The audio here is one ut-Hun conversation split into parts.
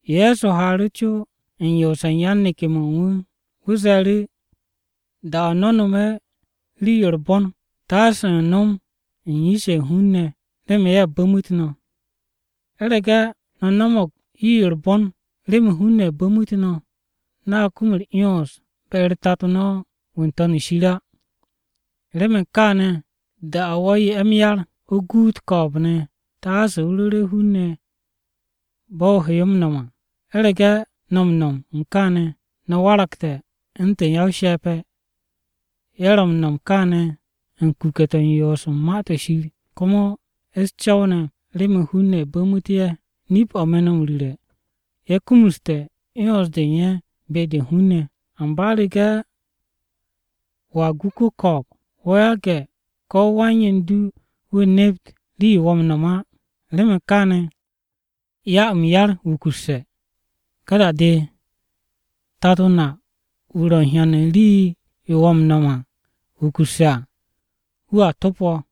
Ye̱so haaru̱ co u̱n yoose̱ u̱n yan-neke̱-mo̱ u̱n wu̱. Wu̱ ze̱e̱ru̱, “Da-o̱ no̱ nome̱ rii-yo u̱r-bon taase no̱ nom u̱n yish-ye̱ u̱n hun-ne̱ remen ye̱ bu̱mu̱t no̱. U̱rege̱ no̱ no̱mo̱g rii-yo u̱r-bon remen hun-ne̱ bu̱mu̱t no̱, no̱a kum u̱r-'yons be-u̱r Tato no̱ wu̱ ro̱ n-To̱n shir á. “Remen kaane̱ da-o̱ wo̱ 'ye m-yar, o guut ko̱o̱b-ne̱, taase o ru̱re̱ hun-ne̱ bo̱ o he yo m-no̱m à. U̱rege̱ no̱ m-no̱m u̱n kaane̱, no̱ waragte̱ u̱ntu̱n ya-o-she̱pe̱, ye̱ ro̱ m-no̱m u̱n kaane̱ u̱n kuke̱-to̱ u̱n yoos u̱n Ma-to̱ Shir, komo u̱s-co̱w ne̱ remen hun-ne̱ bu̱mu̱t ye̱. Nip-o̱ me̱ no̱ m-ru̱re̱, ye̱ kumuste̱ 'yons-de u̱n ye̱ be-de u̱n hun-ne̱. Amba u̱rege̱ wo̱a gu ko-ko̱o̱b, wo̱ yage̱ ko̱ wan-yen-du wu̱ nep rii-yo wo̱ m-no̱m á. Remen kaane̱, 'ya m-yar wukusse̱. Ka da-de, Tato na wu̱ ro̱ m-hyan rii-yo wo̱ m-no̱m wukusse̱ à, wu̱a to̱p wo̱.”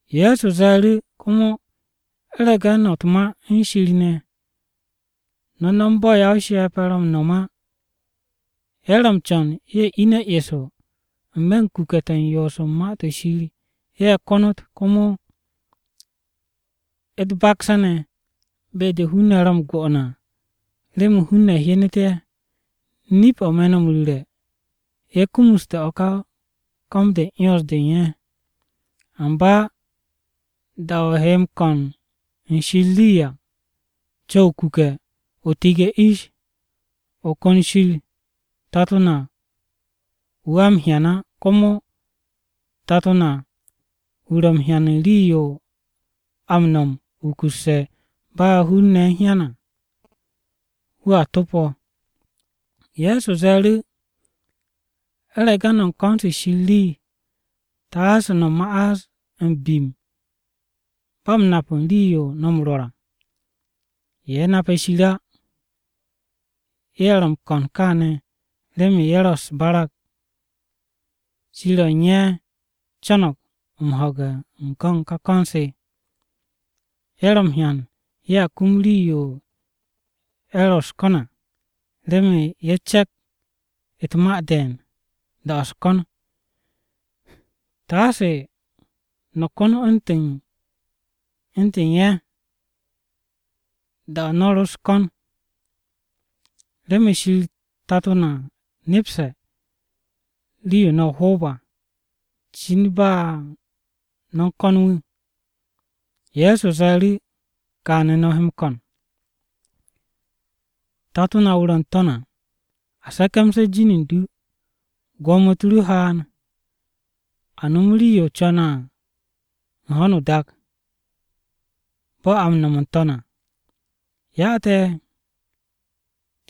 Ye̱so ze̱e̱ru̱, “Komo u̱rege̱ no̱ u̱t-ma u̱n Shir ne̱, no̱ no̱m bo̱ ya-o-she̱pe̱ ro̱ m-no̱m á. Ye̱ ro̱ m-co̱n ye̱ ine̱ eso n-me̱ u̱n kuke̱-to̱ u̱n yoos u̱n Ma-to̱ Shir ye̱ konot, komo u̱t-bakse̱ ne̱ be-de hun-ne̱ ro̱ m-go'one̱ à remen hun-ne̱ hyenet ye̱. Nip-o̱ me̱ no̱ m-ru̱re̱, ye̱ kumuste̱ o̱ ka ko̱m-de u̱n 'yons-de u̱n ye̱. Amba da-o̱ o he m-ko̱n u̱n Shir rii à, co̱w o-kuke̱, o tige̱ ish. O ko̱n Shir Tato na wu̱ a m-hyan á, komo Tato na wu̱ ro̱ m-hyan u̱n rii-yo a no̱me̱ wukusse̱ ba hun-ne̱ u̱n hyan wu̱ á, wu̱a to̱p wo̱.” Ye̱so ze̱e̱ru̱, “U̱rege̱ no̱ u̱n ko̱n u̱n Shir rii, taase no̱ ma'as m-bim ba m-nap u̱n rii-yo no̱ m-rwo̱r á. Ye̱ nape̱ Shir á, ye̱ ro̱ m-ko̱n kaane̱ remen ye̱ ro̱ u̱s-barag shir-ye̱ u̱n ye̱ co̱no̱g m-ho̱ge̱ u̱n go̱n ka ko̱n-se. Ye̱ ro̱ m-hyan ye̱a kum rii-yo ye̱ ro̱ u̱s-ko̱n à, remen ye̱ cepk u̱t-ma de̱e̱n da-o̱ u̱s-ko̱n. Taase no̱ ko̱n u̱ntu̱n ye̱ da-o̱ no̱ u̱s-ko̱n á, remen Shir Tato na nepste̱ rii-yo no̱ o-hoob à, cin ba no̱ u̱n ko̱n wu̱.” Ye̱so ze̱e̱ru̱, “Kaane̱ no̱ he m-ko̱n: “ ‘Tato na wu̱ ro̱ n-To̱n à, A se̱ke̱mse̱ jin u̱n du. Gwo̱mo-u̱t ru haan, A nom rii-yo o co̱ne̱ à ho̱no o-dak, Bo̱ a m-no̱m n-To̱n à. Ya te̱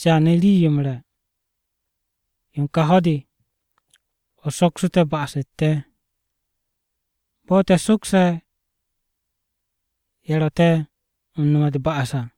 caane̱ rii-yo m-re̱ yo u̱n ka ho̱-de. O soksu̱ te̱ ba'as-u̱t te̱, bo̱ te̱ m-sokse̱ u̱n ye̱ ro̱ te̱ m-no̱me̱ u̱t-ba'as à.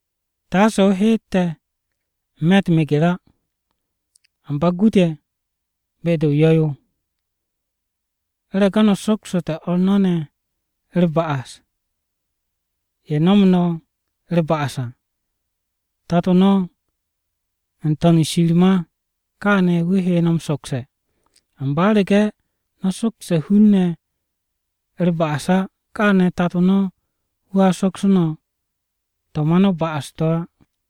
Taase o heet te̱ n-me̱ u̱t-meger á, Amba gu te̱ be-de o-yo̱ yo.’ “U̱rege̱ no̱ soksote̱ o̱r no̱ ne̱ u̱r-ba'as to̱ ye̱ no̱mu̱ no̱ u̱r-ba'as à, Tato no̱ wu̱ n-To̱n shir ma káane̱ wu̱ he no̱ m-sokse̱. Amba u̱rege̱ no̱ sokse̱ hun-ne̱ u̱r-ba'as á, kaane̱ Tato no̱ wu̱a sokse̱ no̱ to̱ ma no̱ ba'as-to̱ á.”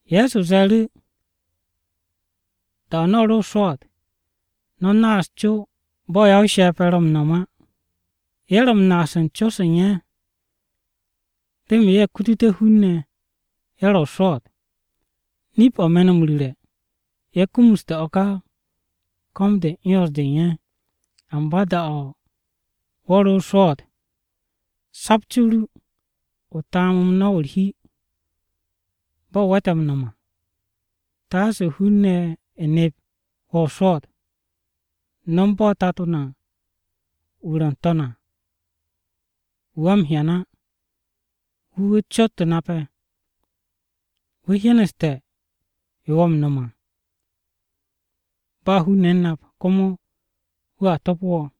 Ye̱so ze̱e̱ru̱, “Da-o̱ no̱ o-swo̱o̱t à, no̱ naas o-co bo̱ ya-o-she̱pe̱ ro̱ m-naas u̱n co-se u̱n ye̱ á. Ye̱ ro̱ m-naas u̱n co-se u̱n ye̱ remen ye̱ kututé̱ hun-ne̱, ye̱ ro̱ o-swo̱o̱t. Nip-o̱ me̱ no̱ m-ru̱re̱, ye̱ kumuste̱ o̱ ka ko̱m-de u̱n 'yons-de u̱n ye̱. Amba da-o̱ wo̱ ro̱ o-swo̱o̱t, sapt co-o ru, o taam m-no̱w u̱r-hi, bo̱ o we̱te̱ m-no̱m à. Taase hun-ne̱ nep wo̱ o-swo̱o̱t. No̱m bo̱ Tato na wu̱ ro̱ n-To̱n à, wu̱ a m-hyan á, wu̱ wu̱ cot nape̱. Wu̱ hyeneste̱ yo wo̱ m-no̱m à ba hun-ne̱ u̱n nap. Komo wu̱a topo wo̱.”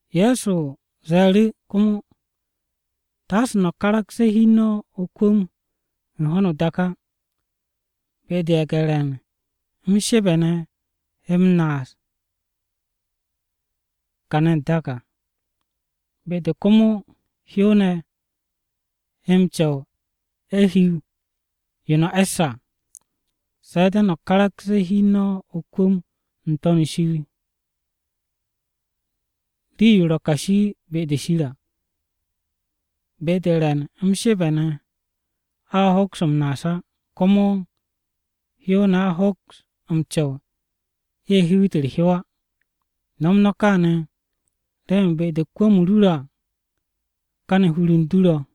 Ye̱so ze̱e̱ru̱ komo, “Taase no̱ karakse̱ hi u̱n no̱ o-kwu̱m u̱n ho̱no o-dak á. Be-de ye̱ge̱-re̱n m-shebe̱ ne̱ he o̱ m-naas à kàne̱ n-dak. Be-de komo hyow-ne̱ he m-co̱w ye̱ hiw yo no̱ e̱sse̱ à. Se̱ de̱ no̱ karakse̱ hi u̱n no̱ o-kwu̱m n-To̱n shir, rii-yo ro̱ kashi be-de Shir à. Be-de re̱n m-shebe̱ ne̱ a hoks o̱ m-naas á, komo hyow-ne̱ a hoks m-co̱w ye̱ hiwit u̱r-hyow á. Nom kaane̱ remen be-de kwu̱m-o ru ro̱ à, káne̱ hur-u̱r du ro̱.”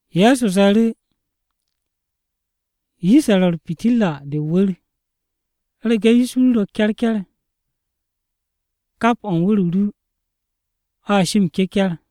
Ye̱so ze̱e̱ru̱, “Yish-ye̱ ro̱ u̱r-pitirra de o-wu̱r, u̱rege̱ yish ru ro̱ ke̱rke̱r, kap u̱n wu̱r-o ru o̱a shi m-cecar ne̱.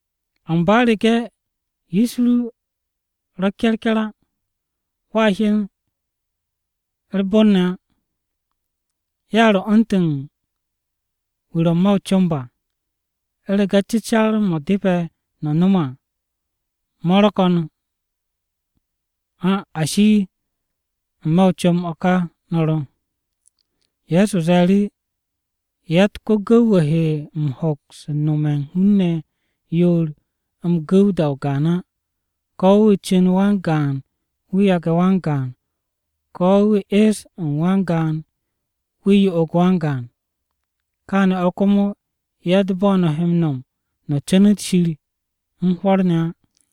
Amba u̱rege̱ yish ru ro̱ ke̱rke̱r á, wo̱a hyen u̱r-bon ne̱ á. Ya ro̱ u̱ntu̱n wu̱ ro̱ n-me̱ o-comb à. U̱rege̱ cecar-mo̱ depe̱ o nom à mo̱ ro̱ ko̱n á, ashi n-me̱ o-comb o̱ ka o ro̱.” Ye̱so ze̱e̱ru̱, “Yatt ko-gu̱w-wu̱ he m-hoks u̱n nome̱ u̱n hun-ne̱ yoor m-gu̱w da-o gaan á, ko̱ wu̱ cu̱n wan-gaan wu̱ yage̱ wan-gaan, ko̱ wu̱ es u̱n wan-gaan wu̱ yo'og wan-gaan, kaane̱ o̱ komo yatt bo̱ no̱ he m-no̱m no̱ cu̱nu̱t Shir u̱n hwo̱r ne̱ á.”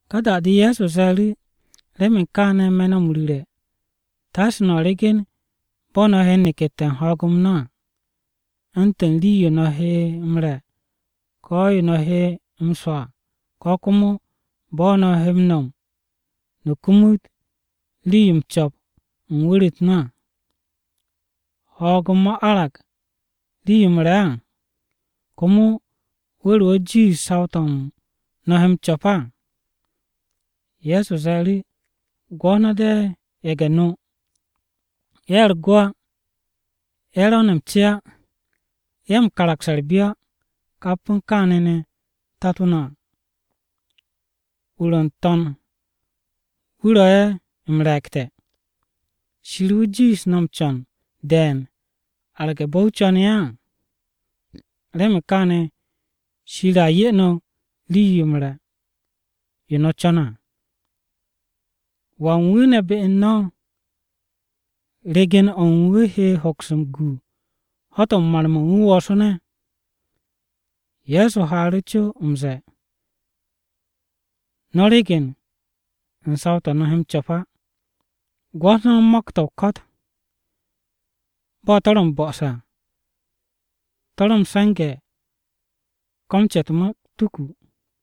Ka da-de Ye̱so ze̱e̱ru̱, “Remen kaane̱ me̱ no̱ m-ru̱re̱, taase no̱ ryegen bo̱ no̱ he nekette̱ m-ho̱o̱g à, u̱ntu̱n rii-yo no̱ he m-re̱, ko̱ yo no̱ he m-swo̱ à, ko̱ komo bo̱ no̱ he m-no̱m no̱ kumut rii-yo m-co̱p u̱n wu̱r-u̱t no̱ á. ¿Ho̱o̱g-m mo̱ arag rii-yo m-re̱ á? ¿Komo wu̱r-o̱ jiish saw-to̱ no̱ he m-co̱p á?” Ye̱so ze̱e̱ru̱, “Gwo̱t no̱ de̱ ye̱ge̱-no. Ye̱ u̱r-go á, ye̱ ro̱ ne̱ m-ce á, ye̱ m-kamas u̱r-byo á. Kap u̱n kaane̱ ne̱ Tato na wu̱ n-To̱n wu̱ ro̱ ye̱ m-re̱e̱gte̱. ¿Shir wu̱ jiish no̱ m-co̱n de̱e̱n arge̱ bo̱ wu̱ co̱ne̱ ye̱ á? Remen kaane̱ Shir a 'ye no̱ rii-yo m-re̱ yo no̱ co̱ne̱ à. ¿Wan wu̱ ne̱ be u̱n no̱ regen-o̱ u̱n wu̱ he hoks m-gu ho̱-to̱ u̱n mar-mo̱ u̱n wu̱ woosu̱ne̱?” Ye̱so haaru̱ co m-ze̱e̱, “No̱ ryegen u̱n saw-to̱ no̱ he m-co̱p á. Gwo̱t no̱ mo̱k-to̱ o-ko̱t bo̱ to̱ ro̱ m-bo̱'o̱se̱ à, to̱ ro̱ m-se̱nge̱ ko̱ m-ce u̱t-gund á.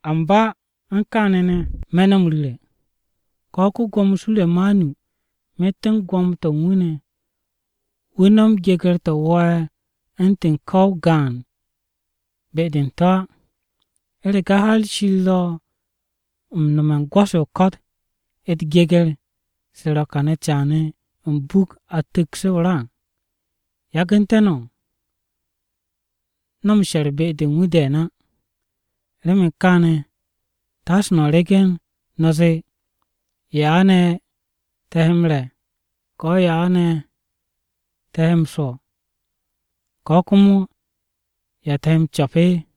Amba kap u̱n kaane̱ ne̱, me̱ no̱ m-ru̱re̱ ko̱ ko-Gwo̱mo Suremanu myet u̱n gwo̱mo-to̱ u̱n wu̱ ne̱, wu̱ no̱m geger-to̱ wo̱o̱'e̱ u̱ntu̱n ko̱ o-gaan be-de u̱n to̱ á. ¿U̱rege̱ har Shir ro̱ m-nome̱ u̱n gwo̱-se o-ko̱t u̱t-geger to̱ ro̱ kane̱ caane̱, m-buk a tu̱ks to̱ à, yagu̱nte̱ no̱? No̱ m-she̱r be-de u̱n wu̱ de̱e̱n á! “Remen kaane̱ taase no̱ ryegen no̱ zee, ‘¿Ya ne̱ te̱ he m-re̱? ¿Ko̱ ya te̱ he m-swo̱?’ Ko̱ komo, ‘¿Ya te̱ he m-co̱p?’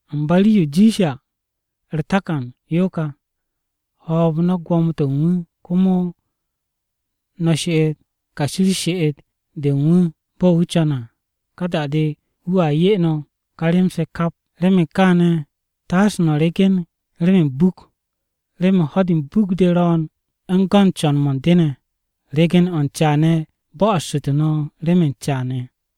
Amba rii-yo jiishe̱ à u̱r-takan yo ka, hoob no̱ gwo̱mo-to̱ u̱n wu̱, komo no̱ she'et kashi u̱r-she'et de u̱n wu̱ bo̱ wu̱ co̱ne̱ à. Ka da-de, wu̱a 'ye no̱ ka rem-se kap. “Remen u̱n kaane̱, taase no̱ ryegen remen m-buk. Remen ho̱-de u̱n buk-de ro̱o̱n u̱n go̱n co̱n-mo̱ u̱n de ne̱. Regen-o̱ u̱n caane̱ bo̱'o̱ssu̱tu̱ no̱ remen caane̱.”